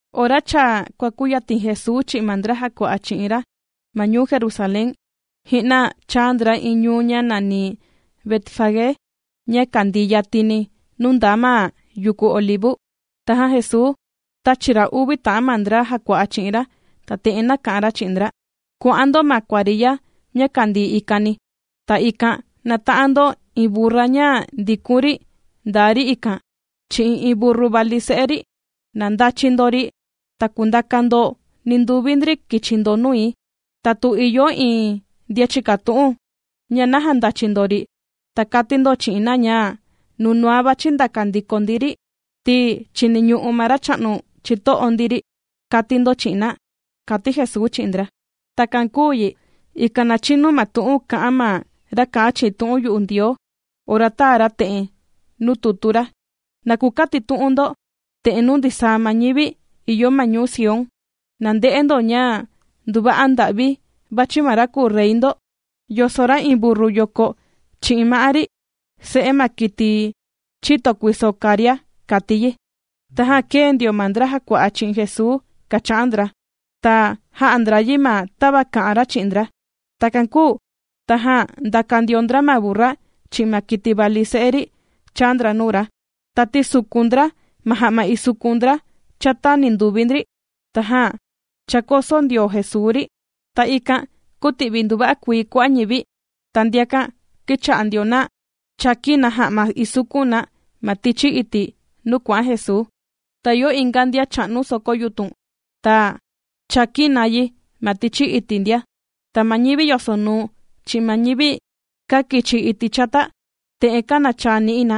Ora cha kuàkuyatin Jesuu chi'in ma ndra jàkua'a chi'in ra ma ñuu Jerusalén, ji'na chāa ndra iin ñuu ña nàni Betfagé, ña kandii yatini nuu ndaa ma yuku Olivu. Tajan Jesuu tāchi ra uvi ta'an ma ndra jàkua'a chi'in ra, ta te'en nāka'an ra chi'in ndra: ―Kuà'an ndo ma kuariya ña kàndii ikani. Ta ikan nàta'an ndo iin burra ña ndikun ri ndaa ri ikan chi'in iin burru vali se'e ri. Na ndachi ndo ri, ta kundaka ndo ninduvi ndri kichi ndo nui. Ta tu ìyo iin ndian chìkatu'un, ña naja ndàchi ndo ri, ta kati ndo chi'in na ña nunua vàchi ndaka ndiko ndi ri, ti chìniñu'u ma racha'nu chito'o ndi ri, kati ndo chi'in na ―kàti Jesuu chi'in ndra. Takan kūu yi, ikan na chinu ma tu'un kā'an ma ra kà'an chi'in tu'un yu'u Ndioo, ora tāa ra te'en nuu tutu ra: Na kukatitu'un ndo te'en nuu ndisaa ma ñivi ìyo ma ñuu Sión: “Na nde'e ndo ña nduva'a nda'vi vàchi ma ra kùu Rey ndo yoso ra iin burru yoko chi'in ma'á ri, se'e ma kiti chìto kuiso karia”, kàti yi. Tajan kēe ndio ma ndra jàkua'a chi'in Jesuu kàcha'an ndra, ta jā'a ndra yi ma tava kā'an ra chi'in ndra. Takan kūu tajan ndàka ndio ndra ma burru, chi'in ma kiti vali se'e ri chāa ndra nuu ra, ta tīsukun ndra ma ja'ma isukun ndra chata ninduvi ndri, tajan chākoso ndio Jesuu ri. Ta ikan kūti'vi nduva'a kuii kua'a' ñivi. Ta ndiakan kīcha'a ndio na chàkin na ja'ma isukun na ma tichi iti' nuu kuà'an Jesuu. Ta ìyo inga ndian chā'nu soko yutun, ta chākin na yi ma tichi iti' ndia. Ta ma ñivi yosonuu, chi'in ma ñivi kàkichi iti' chata, te'en kànachaa ni'i na: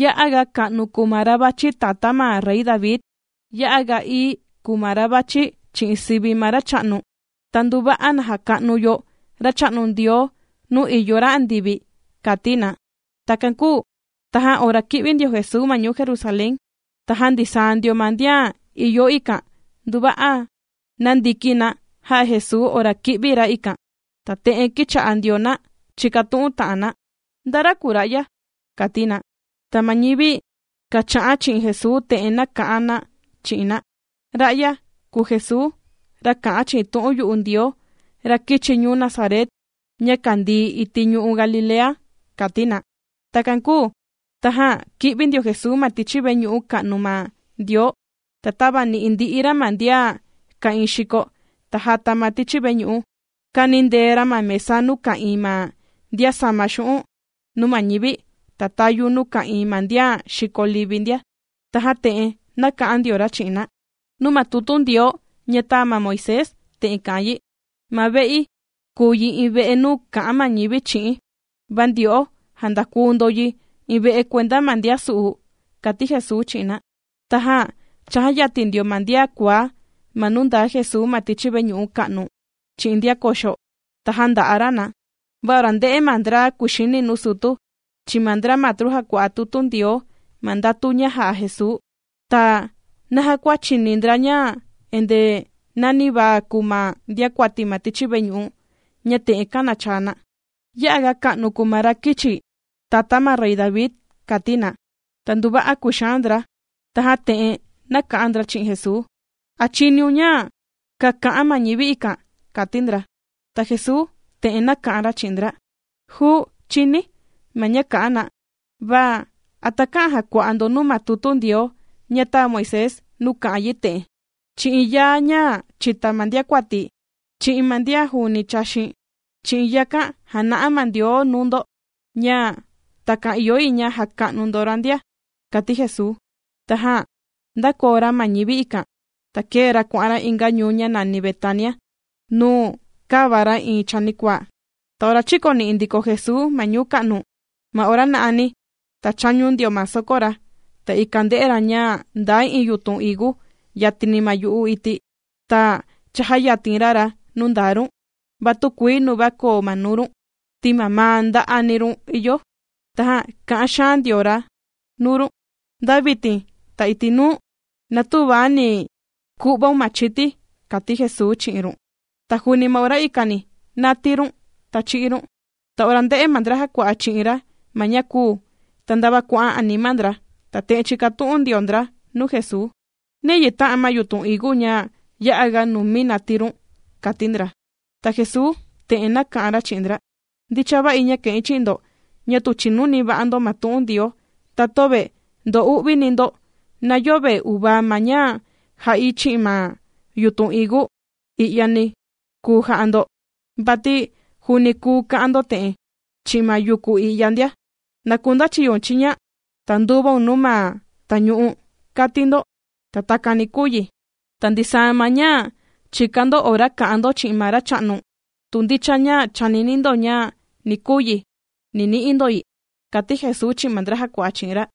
―¡Ya'a ga ka'nu kùu ma ra vàchi tata ma rey David! ¡Ya'a ga ií kùu ma ra vàchi chi'in sivi ma Racha'nu! ¡Ta nduva'a na jaka'nu yo Racha'nu Ndioo nuu ìyo ra andivi! ―kàti na. Takan kūu tajan ora kī'vi ndio Jesuu ma ñuu Jerusalén, tajan ndisaa ndio ma ndian ìyo ikan nduva'a nāndiki na jā'a Jesuu ora kī'vi ra ikan. Ta te'en kīcha'a ndio na chìkatu'un ta'an na: ―¿Nda ra kùu ra'ya? ―kàti na. Ta ma ñivi kàcha'an chi'in Jesuu te'en nāka'an na chi'in na: ―Ra'ya kùu Jesuu, ra kà'an chi'in tu'un yu'u Ndioo, ra kīchi ñuu Nazaret, ña kàndii iti' ñu'u' Galilea ―kàti na. Takan kūu tajan kī'vi ndio Jesuu ma tichi veñu'u ka'nu ma Ndioo, ta tāvani'i ndi'i ra ma ndian ka'ìin xiko, ta jata ma tichi veñu'u. Kānindee ra ma mesa nuu ka'ìin ma ndian sàma xu'un' nuu ma ñivi, ta tayu nuu ka'ìin ma ndian xìko livi ndia. Tajan te'en nāka'an ndio ra chi'in na: ―Nuu ma tutu Ndioo ña tāa ma Moisés te'en kà'an yi: “Ma ve'i kùu yi iin ve'e nuu kà'an ma ñivi chi'i̱n.” Va ndyo'o, jāndakuu ndo yi iin ve'e kuenda ma ndian su'u ―kàti Jesuu chi'in na. Tajan chājayatin ndio ma ndian kuaá ma nuu ndaa Jesuu ma tichi veñu'u ka'nu, chi'in ndian koxo, ta jānda'a ra na. Va ora ndē'e ma ndra kuxini nuu sutu, chi'in ma ndra matru jàkua'a tutu Ndioo ma ndatu ña jà'a Jesuu, ta naja kua chìni ndra ña endee nanivaa kùu ma ndiakuati ma tichi veñu'u, ña te'en kànachaa na: “Ya'a ga ka'nu kùu ma ra kīchi tata ma rey David”, kàti na, ta nduva'a kūxaan ndra. Tajan te'en nāka'an ndra chi'in Jesuu: ―¿A chìniun ña kàka'an ma ñivi ikan? ―kàti ndra. Ta Jesuu te'en nāka'an ra chi'in ndra: ―Juu, chìni̱ ma ña kà'an na, va ¿a takä'an jakua'a ndo nuu ma tutu Ndioo ña tāa Moisés nuu kà'an yi te'en?: Chi'in yaa ña chìta ma ndiakuati, chi'in ma ndian juuni chàxin, chi'in yakan jàna'a ma Ndioo nuu ndo, ña takan ìyo yi ña jaka'nu ndo ra ndia kàti Jesuu. Tajan ndākoo ra ma ñivi ikan, ta kēe ra kuà'an ra inga ñuu ña nàni Betania, nuu kāva ra iin chanikuaa. Ta ora chīkoni'i ndiko Jesuu ma ñuu ka'nu, ma ora na'ani, ta chāñu ndio ma soko ra. Ta ikan ndē'e ra ña ndaa iin yutun higu yatini ma yu'u iti', ta chājayatin ra ra nuu ndaa run, va tükuii nuva koo ma nuu run, ti mamaa nda'ani run ìyo. Tajan kā'an xaan ndio ra run: ―¡Nda vitin, ta iti' nuu, na tüva ni ku'vaun ma chiti! ―kàti Jesuu chi'in run. Ta juuni ma ora ikani nātii run, ta chī'í run. Ta ora ndē'e ma ndra jàkua'a chi'in ra ma ña kūu, ta ndava kuà'an anima ndra, ta te'en chīkatu'un ndio ndra nuu Jesuu: ―¿Niyi tā'an ma yutun higu ña yā'a ga numi nātii run? ―kàti ndra. Ta Jesuu te'en nāka'an ra chi'in ndra: ―Ndicha va'i ña kà'in chi'in ndo, ña tu chìnu va'ani ndo ma tu'un Ndioo, ta töve ndo'uvini ndo, na yöve uvaa ma ña jā'i chi'in ma yutun higu i'yani kùu ja'a ndo, vati juuni kùu ka'an ndo te'en, chi'in ma yuku i'ya ndia: “¡Na kundachiyoun chiña, ta nduvaun nuu ma tañu'u!”, kati ndo, ta takan ni kuu yi. Ta ndisaa ma ña chìkan ndo ora kà'an ndo chi'in ma Racha'nu, tu ndicha ña chànini ndo ña ni kuu yi, ni ni'i ndo yi ―kàti Jesuu chi'in ma ndra jàkua'a chi'in ra.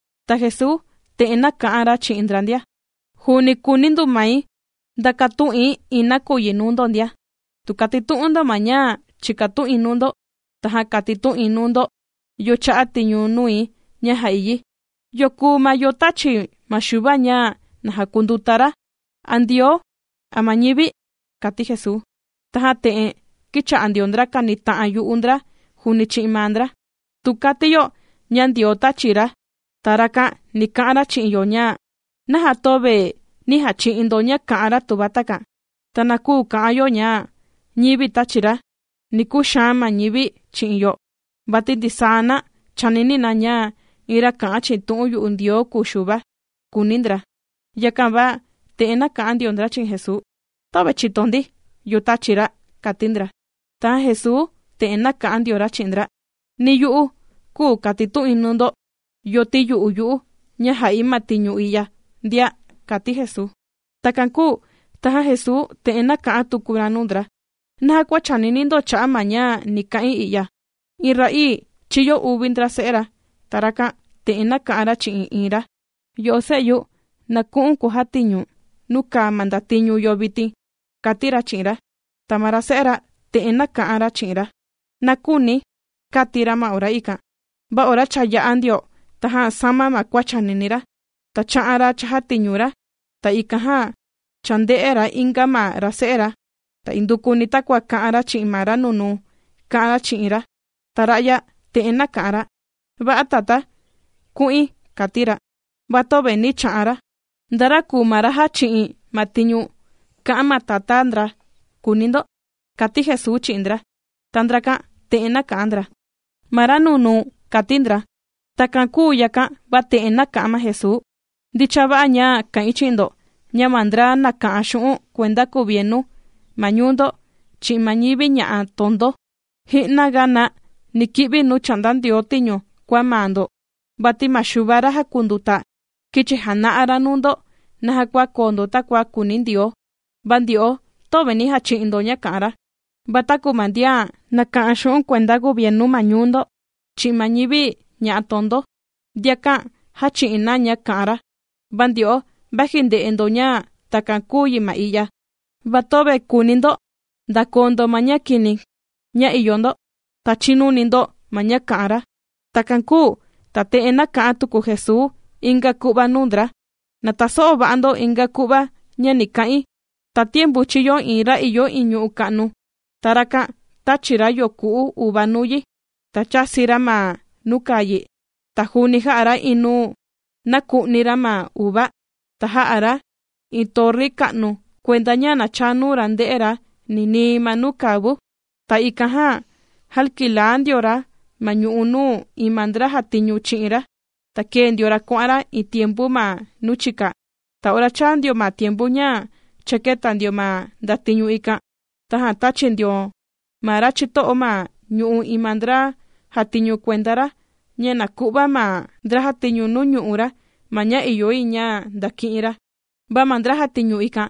Ta Jesuu te'en nāka'an ra chi'in ndra ndia: ―Juuni kùuni du mai ndakatu'in iin nakuyi nuu ndo ndia, tu katitu'un ndo ma ña chìkatu'in nuu ndo, tajan katitu'in nuu ndo yo chā'a tiñu nui ña jā'i yi. ¿Yo kùu ma yo tāchi ma Xuva ña na jakunduta ra?, ¿a Ndioo, a ma ñivi? ―kàti Jesuu. Tajan te'en kīcha'a ndio ndra kànita'an yu'u ndra juuni chi'in maa ndra: ―Tu kati yo: “Ña Ndioo tāchi ra”, ta rakan ni ka'an ra chi'in yo ña: “¿Naja töve nī jachi'in ndo ña kà'an ra tuva takan?” Ta na küu kà'an yo ña: “ñivi tāchi ra”, ni kuxaan ma ñivi chi'in yo, vati ndisaa na chànini na ña iin ra kà'an chi'in tu'un yu'u Ndioo kùu Xuva ―kūuni ndra. Yakan va te'en nāka'an ndio ndra chi'in Jesuu: ―Töve chìto ndi, yo tāchi ra ―kàti ndra. Tajan Jesuu te'en nāka'an ndio ra chi'in ndra: ―Ni yu'u, küu katitu'in nuu ndo yo tīyu'u yu'u ña jà'i ma tiñu i'ya ndia ―kàti Jesuu. Takan kūu tajan Jesuu, te'en nāka'an tuku ra nuu ndra: ―¿Naja kua chànini ndo cha'a' ma ña ni ka'in i'ya? Iin ra'ii chīyo uvi ndra se'e ra. Ta rakan, te'en nāka'an ra chi'in iin ra: “Yo'o se'yu, na ku'u̱n kujatiñu̱n nuu kàa ma ndatiñu yo vitin”, kàti ra chi'in ra. Ta ma ra se'e ra, te'en nāka'an ra chi'in ra: “¡Na küuni̱!”, kāti ra ma ora ikan. Va ora cha yā'a ndio tajan sāma ma kua chànini ra, ta chā'an ra chājatiñu ra. Ta ikan jan chānde'e ra inga ma ra se'e ra, ta indukuni takua kā'an ra chi'in ma ra nunuu, kā'an ra chi'in ra. Ta ra'ya te'en nāka'an ra: “Va'a tatá, ku'in”, kāti ra. Va töve nī cha'an ra. ¿Nda ra kùu ma ra kāndicha ma tiñu kā'an ma tatá ndra?, kùuni ndo ―kàti Jesuu chi'in ndra. Ta ndrakan te'en nāka'an ndra: ―Ma ra nunuu ―kāti ndra. Takan kūu yakan va te'en nāka'an ma Jesuu: ―Ndicha va'a ña kà'in chi'in ndo, ña ma ndra nàka'an xu'un' kuenda kuvienu ma ñuu ndo, chi'in ma ñivi ña'a tondo, ji'na ga na ni ki'vi nuu chà'nda Ndioo tiñu kua maa ndo. Vati ma Xuva ra jàkunduta kīchi jana'a ra nuu ndo naja kuu yi ña koo ndo takua kùuni Ndioo, va ndyo'o töve nī jachi'in ndo ña kà'an ra. Va taku ma ndian nàka'an xu'un' kuenda kuvienu ma ñuu ndo, chi'in ma ñivi ña'a tondo, ndiakan jāchi'in na ña kā'an ra. Va ndyo'o, vaji ndē'e ndo ña takan kūu yi ma i'ya, va töve kùuni ndo sama ndo ma kua kini kua ìyo ndo, ta chinuni ndo ma ña kà'an ra. Takan kūu ta te'en nāka'an tuku Jesuu inga ku'va nuu ndra: ―Na taso'o va'a ndo ma inga ku'va ña ni ka'in: Tatiempu chīyo iin ra ìyo iin ñu'u' ka'nu, ta rakan tāchi ra yoku'u uva nuu yi, ta chāsi ra ma nuu kàa yi. Ta juuni jā'a ra iin nuu naku'ni ra ma uva, ta jā'a ra iin torri ka'nu kuenda ña na chaa nuu ra nde'e ra ninii ma nuu kàa vu. ’Ta ikan jan jākilaa ndio ra ma ñu'u nuu iin ma ndra jàtiñu chi'in ra, ta kēe ndio ra kuà'an ra iin tiempu ma nuu chika. Ta ora chāa ndio ma tiempu ña cha kēta ndio ma ndatiñu ikan, tajan tāchi ndio ma ra chito'o ma ñu'u' iin ma ndra jàtiñu kuenda ra ña na ku'va ma ndra jàtiñu nuu ñu'u' ra ma ña ìyo yi ña ndaki'in ra. Va ma ndra jàtiñu ikan,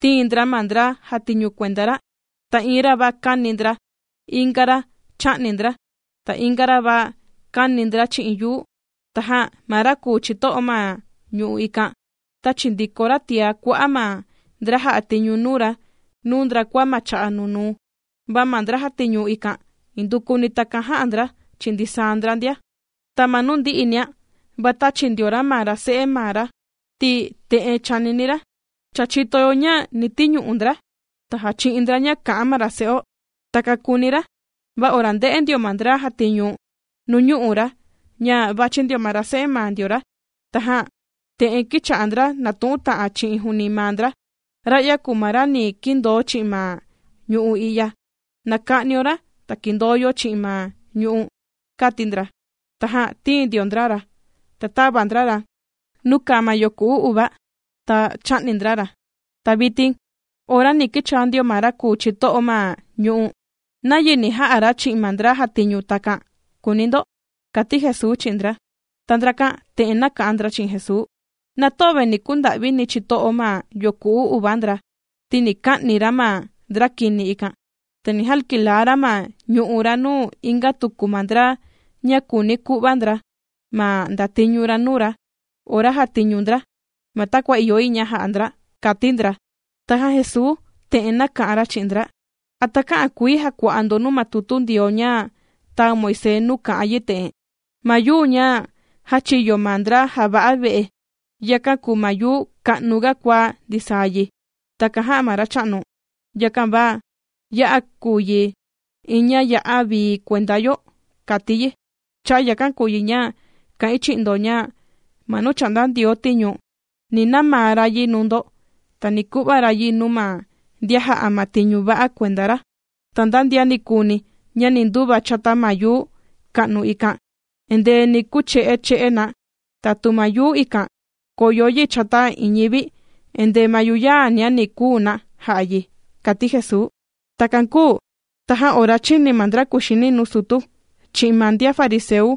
tīin ndra ma ndra jàtiñu kuenda ra, ta iin ra va kāni ndra, inga ra chā'ni ndra, ta inga ra va kāni ndra chi'in yuu. Tajan ma ra kùu chito'o ma ñu'u' ikan, tāchi ndiko ra tiá kua'a' ma ndra jà'a tiñu nuu ra nuu ndra kua ma cha'a' nunuu, va ma ndra jàtiñu ikan, indukuni takan jā'a ndra chi'in ndisaa ndra ndia. ’Ta ma nuu ndi'inia, va tāchi ndio ra ma ra se'e maa ra, ti te'en chānini ra: “Cha chìto yo ña ni tiñu'u ndra, ta jàchi'in ndra ña kà'an ma ra se'o.” Takan kūuni ra. Va ora ndē'e ndio ma ndra jàtiñu nuu ñu'u' ra ña vàchi ndio ma ra se'e maa ndio ra, tajan te'en kīcha'a ndra nàtu'un ndra juuni chi'in maa ndra: “Ra'ya kùu ma ra ni kindoo chi'in ma ñu'u' i'ya, na ka'nio ra, ta kindoo yo chi'in ma ñu'u'”, kāti ndra. Tajan tīin ndio ndra ra, ta tāva ndra ra nuu kàa ma yoku'u uva, ta chā'ni ndra ra. ’Ta vitin ora ni kichaa ndio ma ra kùu chito'o ma ñu'u', ¿nayi ni ja'a ra chi'in ma ndra jàtiñu takan?, kùuni ndo ―kàti Jesuu chi'in ndra. Ta ndrakan te'en nāka'an ndra chi'in Jesuu: ―Na töve nī kunda'vini chito'o ma yoku'u uva ndra, ti ni ka'ni ra ma ndra kini ikan, ta ni jakilaa ra ma ñu'u' ra nuu inga tuku ma ndra ña kùuni ku'va ndra ma ndatiñu ra nuu ra ora jàtiñu ndra, ma takua ìyo yi ña ja'a ndra ―kàti ndra. Tajan Jesuu te'en nāka'an ra chi'in ndra: ―¿A takä'an kuii jakua'a ndo nuu ma tutu Ndioo ña tāa Moisés nuu kà'an yi te'en?: Ma yuu ña jāchiyo ma ndra jàva'a ve'e, yakan kùu ma yuu ka'nu ga kua ndisaa yi, takan jā'a ma Racha'nu, Yakan va ña'a kùu yi iin ña ya'a vii kuenda yo, kàti yi. ’Cha'a' yakan kùu yi ña kà'in chi'in ndo ña ma nuu chà'nda Ndioo tiñu, ni namaa ra yi nuu ndo, ta ni ku'va ra yi nuu ma ndian jà'a ma tiñu va'a kuenda ra. Ta nda ndian nikuuni ña ni nduva chata ma yuu ka'nu ikan, endee ni kuche'e che'e na, tatu ma yuu ikan kòyo yi chata iin ñivi, endee ma yuyaania ni kuu na ja'a yi ―kàti Jesuu. Takan kūu tajan ora chīni ma ndra kuxini nuu sutu, chi'in ma ndian fariseu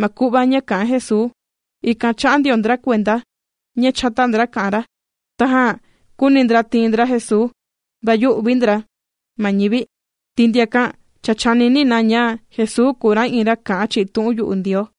ma ku'va ña kā'an Jesuu, ikan chā'a ndio ndra kuenda ña chata ndra kà'an ra. Tajan kūuni ndra tiin ndra Jesuu, va yū'vi ndra ma ñivi, ti ndiakan cha chànini na ña Jesuu kùu ra iin ra kà'an chi'in tu'un yu'u Ndioo.